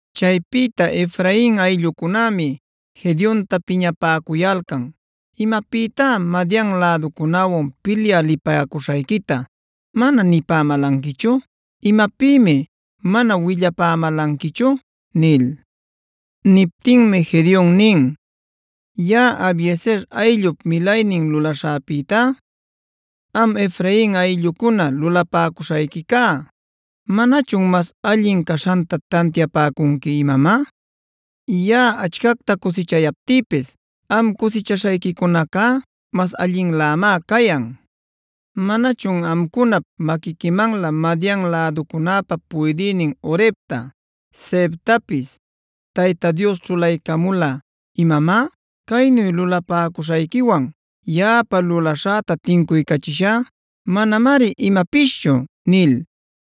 Chaypïta Efrain ayllucunämi Gedeonta piñapäcuyalcan: “¿Imapïtá Madian läducunäwan pilyä lipäcuśhayquita mana nipämälanquichu? ¿Imapïmi mana willapämälanquichu?” nil. Niptinmi Gedeon nin: “Yaꞌa Abiezer ayllup milaynin lulaśhäpïtá am Efrain ayllucuna lulapäcuśhayquica, ¿manachun mas allin caśhanta tantiapäcunqui imamá? Yaꞌa achcacta cusichayaptïpis am cusichaśhayquicunacá mas allinlämá cayan. ¿Manachun amcunap maquiquimanlä Madian läducunäpä puydïnin Orebta, Zeebtapis Tayta Dios ćhulaycamula, imamá? Caynu lulapäcuśhayquiwan yaꞌapa lulaśhäta tincuycachishá manamari imapischu” nil.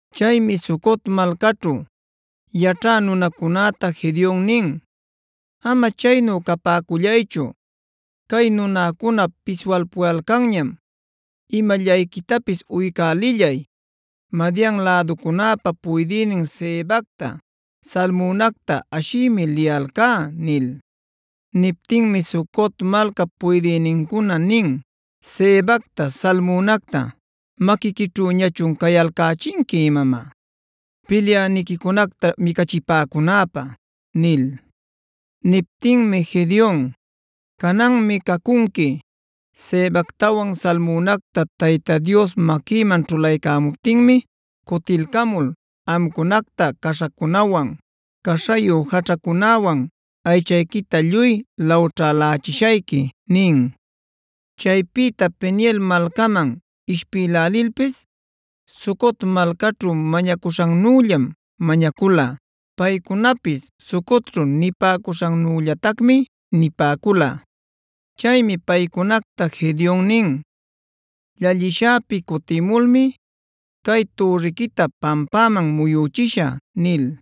Chaymi Sucot malcaćhu yaćhä nunacunäta Gedeon nin: “Ama chaynu capäcullaychu, cay nunäcuna piswalpuyalcanñam; imallayquitapis uycälillay. Madian läducunäpa puydïnin Zebacta, Zalmunacta ashïmi liyalcá” nil. Niptinmi Sucot malcap puydïnincuna nin: “¿Zebacta, Zalmunacta maquiquićhüñachun cayalcächinqui imamá, pilyäniquicunacta micachipäcunäpä?” nil. Niptinmi Gedeon: “Cananmi cacunqui, Zebactawan Zalmunacta Tayta Dios maquïman ćhulaycämuptinmi cutilcamul, amcunacta caśhacunawan, caśhayu jaćhacunawan aychayquita lluy lawćhälächiśhayqui” nin. Chaypïta Peniel malcaman ishpïlälilpis Sucot malcaćhu mañacuśhannüllam mañacula. Paycunapis Sucotćhu nipäcuśhannüllatacmi nipäcula. Chaymi paycunacta Gedeon nin: “Llallishäpi cutïmulmi cay türriquita pampäman muyüchishä” nil.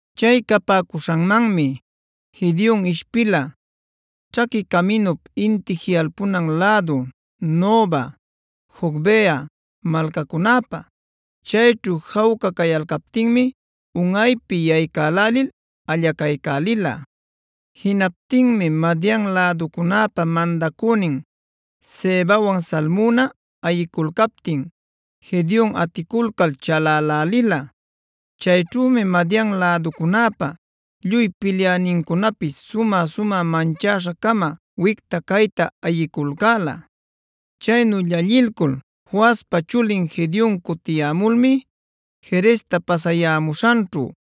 Chay capäcuśhanmanmi Gedeon ishpila ćhaqui caminup inti jiꞌalpunan lädu Noba, Jogbeha malcacunäpa. Chayćhu jawca cayalcaptinmi unꞌaypi yaycaycälil allacaycälila. Jinaptinmi Madian läducunäpa mandacünin Zebawan Zalmuna ayiculcaptin Gedeon aticulcal chalälälila. Chayćhümi Madian läducunäpa lluy pilyänincunapis sumä-sumä manchäśha-cama wicta-cayta ayiculcäla. Chaynu llallilcul Joaspa chulin Gedeon cutiyämulmi Jeresta pasayämuśhanćhu,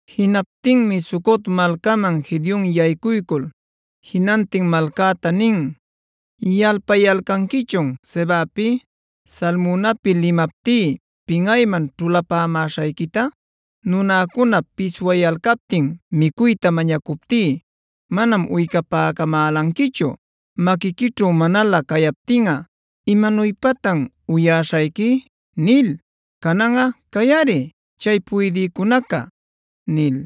Jinaptinmi Sucot malcäman Gedeon yaycuycul jinantin malcäta nin: “¿Yalpayalcanquichun Zebapi, Zalmunapi limaptí pinꞌayman ćhulapämäśhayquita? Nunäcuna piswayalcaptin micuyta mañacuptí manam uycapämälanquichu: ‘Maquiquićhu manalä cayaptinꞌa ¿imanuypatan uyäśhayqui?’ nil. Cananꞌa ¡cayꞌari chay puydïcunaca!” nil.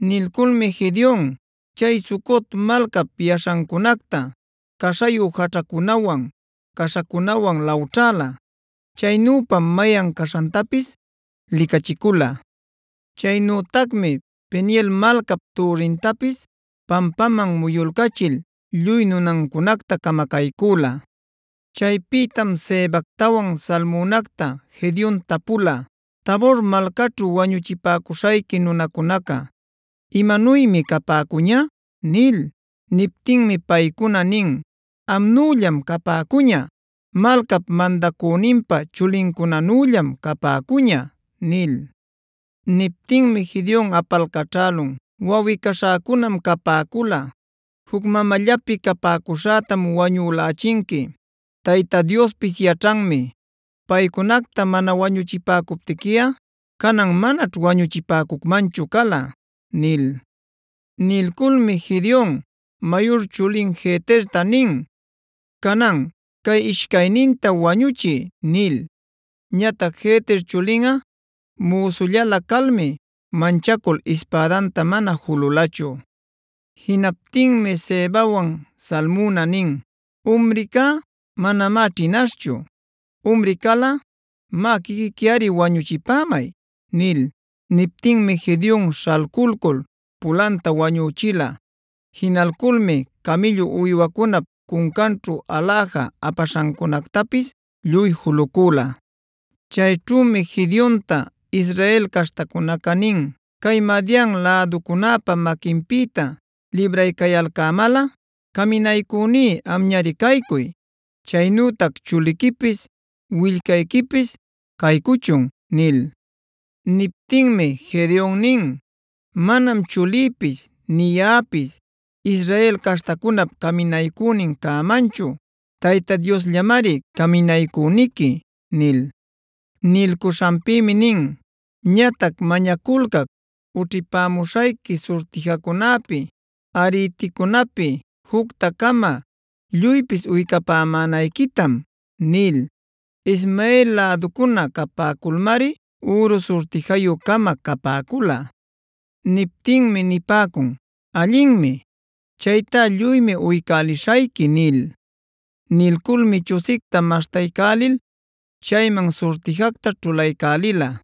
Nilculmi Gedeon chay Sucot malcap yaśhancunacta caśhayu jaćhacunawan, caśhacunawan lawćhäla. Chaynüpam mayan caśhantapis licachicula. Chaynütacmi Peniel malcap türrintapis pampaman muyulcachil lluy nunancunacta camacaycüla. Chaypïtam Zebactawan Zalmunacta Gedeon tapula: “Tabor malcaćhu wañuchipäcuśhayqui nunacunaca, ¿imanuymi capäcuña?” nil. Niptinmi paycuna nin: “Amnüllam capäcuña. Malcap mandacüninpa chulincunanüllam capäcuña” nil. Niptinmi Gedeon apalcaćhälun: “¡Wawꞌi-caśhäcunam capäcula! ¡Juc mamallapi capäcuśhätam wañülächinqui! Tayta Diospis yaćhanmi, paycunacta mana wañuchipäcuptiquiꞌa canan manaćh wañuchipäcucmanchu cala” nil. Nilculmi Gedeon mayur chulin Jeterta nin: “Canan, cay ishcayninta wañuchiy” nil. Ñatac Jeter chulinꞌa müsullalä calmi manchacul ispädanta mana jululachu. Jinaptinmi Zebawan, Zalmuna nin: “¡Umrica manamá ćhinaśhchu! ¡Umri calꞌa, má quiquiquiꞌari wañuchipämay!” nil. Niptinmi Gedeon śhalculcul pulanta wañüchila. Jinalculmi camïllu uywancunap cuncanćhu aläja apaśhancunactapis lluy julucüla. Chayćhümi Gedeonta Israel caśhtacunaca nin: “Cay Madian läducunäpa maquinpïta libraycayalcämalꞌa caminaycüní amñari caycuy, chaynütac chuliquipis, willcayquipis caycuchun” nil. Niptinmi Gedeon nin: “Manam chulïpis nï yaꞌapis Israel caśhtacunap caminaycünin cämanchu. Tayta Diosllamari caminaycüniqui” nil. Nilcuśhanpïmi nin: “Ñatac mañaculcac ućhipämuśhayqui surtijacunapi, ariticunapi jucta-cama lluypis uycapämanayquitam” nil. Ismael läducuna capäculmari üru surtijayu-cama capäcula. Niptinmi nipäcun: “Allinmi; chaytá lluymi uycälishayqui” nil. Nilculmi chusicta maśhtaycälil chayman surtijacta ćhulaycälila.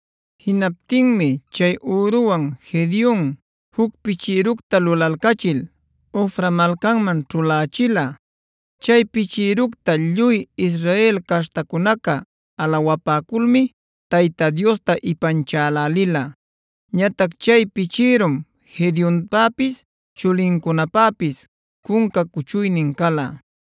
Jinaptinmi chay üruwan Gedeon juc pichïructa lulalcachil Ofra malcanman ćhulächila. Chay pichïructa lluy Israel caśhtacunaca alawapäculmi Tayta Diosta ipanchälälila. Ñatac chay pichïrum Gedeonpäpis, chulincunapäpis cunca cuchuynin cala.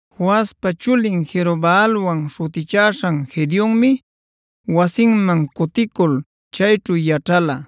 Joaspa chulin Jerobaalwan śhutichäśhan Gedeonmi wasinman cuticul chayćhu yaćhala.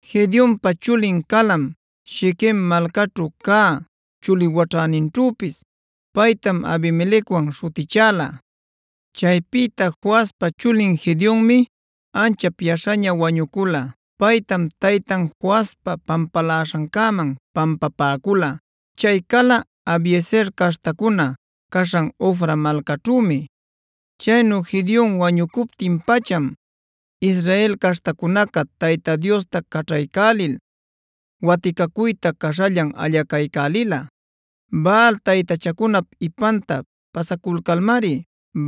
Gedeonpa chulin calam Shiquem malcaćhu cä chuli waćhäninćhüpis; paytam Abimelecwan śhutichäla. Chaypïta Joaspa chulin Gedeonmi anchap yaśhaña wañucula. Paytam taytan Joaspa pampaläśhancäman pampapäcula. Chay cala Abiezer caśhtacuna caśhan Ofra malcaćhümi. Chaynu Gedeon wañucuptin-pacham Israel caśhtacunaca Tayta Diosta caćhaycälil waticacuyta caśhallan allacaycälila. Baal taytachacunap ipanta pasaculcalmari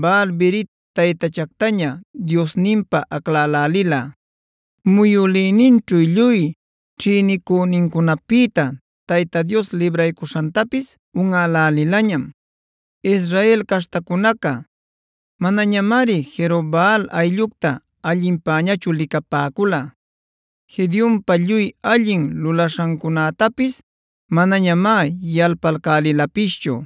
Baal-berit taytachactaña diosninpä aclacälälila. Muyülïninćhu lluy ćhïnicünincunapïta Tayta Dios libraycuśhantapis unꞌälälilañam. Israel caśhtacunaca manañamari Jerobaal ayllucta allinpañachu licapäcula; Gedeonpa lluy allin lulaśhancunätapis manañamá yalpalcälilapischu.